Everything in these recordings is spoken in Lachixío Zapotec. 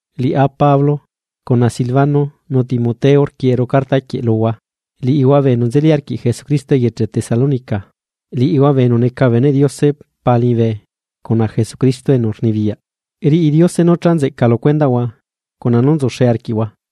Liꞌá Pablo, cuna Silvano nu Timoteo, rquieꞌeru carta quieꞌ luhua, liꞌihua bee enu nzeli arquiꞌ Jesucristo eyeche Tesalónica, liꞌihua bee enu neca bee beneꞌ Diose Pa liñibe cuna Jesucristo enu rnibiyaꞌ. Riꞌi Diose nú cha nzeꞌca lu cuendaꞌhua cuna nú nzuxe arquiꞌhua.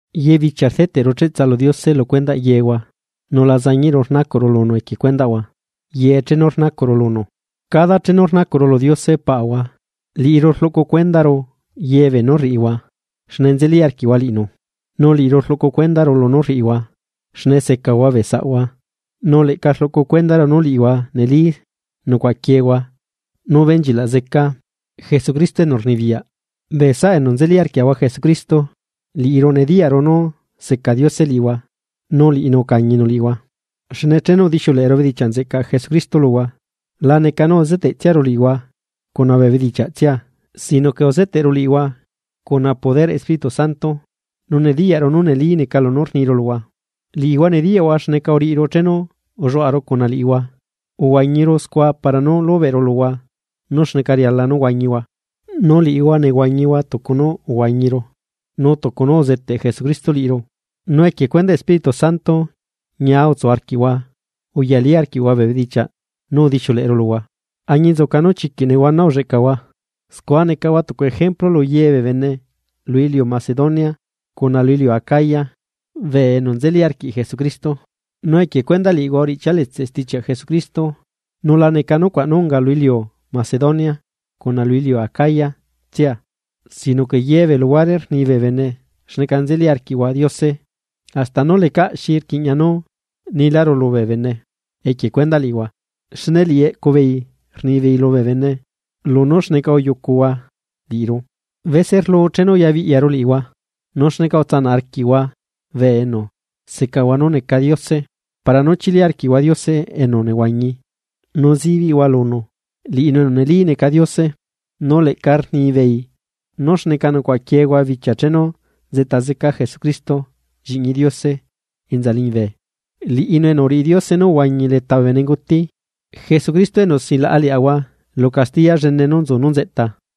Ye bichia rdeteꞌru cheꞌtsa lu Diose lu cuendaꞌ yehua nu la zañiꞌru rnacuꞌru lunu equie cuendaꞌhua ye chenu rnacuꞌru lunu. Cada chenu rnacuꞌru lu Diose Paꞌahua liꞌiru rluꞌcu cuendaru ye beenú rriꞌihua xne nzeli arquiꞌhua liꞌinu, nu liꞌiru rluꞌcu cuendaru lunú rriꞌihua xne secahua bee saꞌhua nu leꞌca rluꞌcu cuendaru nu liꞌihua neli nucuaꞌaquiehua nú benchilaꞌ zeca Jesucristo enu rnibiyaꞌ. Bee saꞌa enu nzeli arquiaꞌahua Jesucristo, liꞌiru nediyaꞌru nu seca Diose liꞌihua nu liꞌinu ucañinu liꞌihua. Xne chenu udixiuleꞌeru bedichiaꞌ nzeꞌcaꞌ Jesucristo luhua, la neca nú uzeteꞌtsiaru liꞌihua cuna bee bedichiaꞌtsia sino que uzeteꞌru liꞌihua cuna poderꞌ Espíritu Santo nu nediyaꞌru nú neli neca lunú rniru luhua. Liꞌihua nediyaꞌhua xneca uriꞌiru chenu ulluaꞌaru cuna liꞌihua, uhuañiru scua para nú lubeꞌru luhua nú xneca riala nú huañihua. Nu liꞌihua nehuañihua tucu nú uhuañiru nu tucu nú uzeteꞌ Jesucristo liꞌiru, nu equie cuedaꞌ Espíritu Santo ñia utsu arquiꞌhua uyalí arquiꞌhua bee bedichiaꞌ nú udixiuleꞌeru luhua añinzuca nú chiquiꞌ nehuana ulleꞌcahua. Scua necahua tucu ejemplu lu ye bee bene lu iliu Macedonia cuna lu iliu Acaya ante lu bee enu nzeli arquiꞌ Jesucristo. Nu equie cuendaꞌ liꞌihua uriꞌchialetse stichiaꞌ Jesucristo nu la neca nucuaꞌ nú unga lu iliu Macedonia cuna lu iliu Acaya tsia, sino que ye bee luhuare rni bee bene xneca nzeli arquiꞌhua Diose hasta nú lecaꞌ xi rquiꞌña nú niláru lubee bene equie cuendaꞌ liꞌihua. Xne liꞌi eꞌcu beei rnibeei lubee bene lunú xneca uyucuhua liꞌiru bese rlu chenu ubelabiꞌyaru liꞌihua, nu xneca utsana arquiꞌhua bee enu secahua nú neca diose para nú chili arquiꞌhua Diose enu nehuañi nu zibiꞌhua lunu, liꞌinu enu neli neca Diose. Nu leꞌca rnibeei nú xneca nucuaꞌaquiehua bichia chenu nzeꞌta zeca Jesucristo Lliꞌñi Diose enza liñibe, liꞌinu enu uriꞌi Diose nú uhuañi leta bee benenguti. Jesucristo enu silaꞌa liaꞌahua lu castiya llene nú nzu nú nzeꞌta.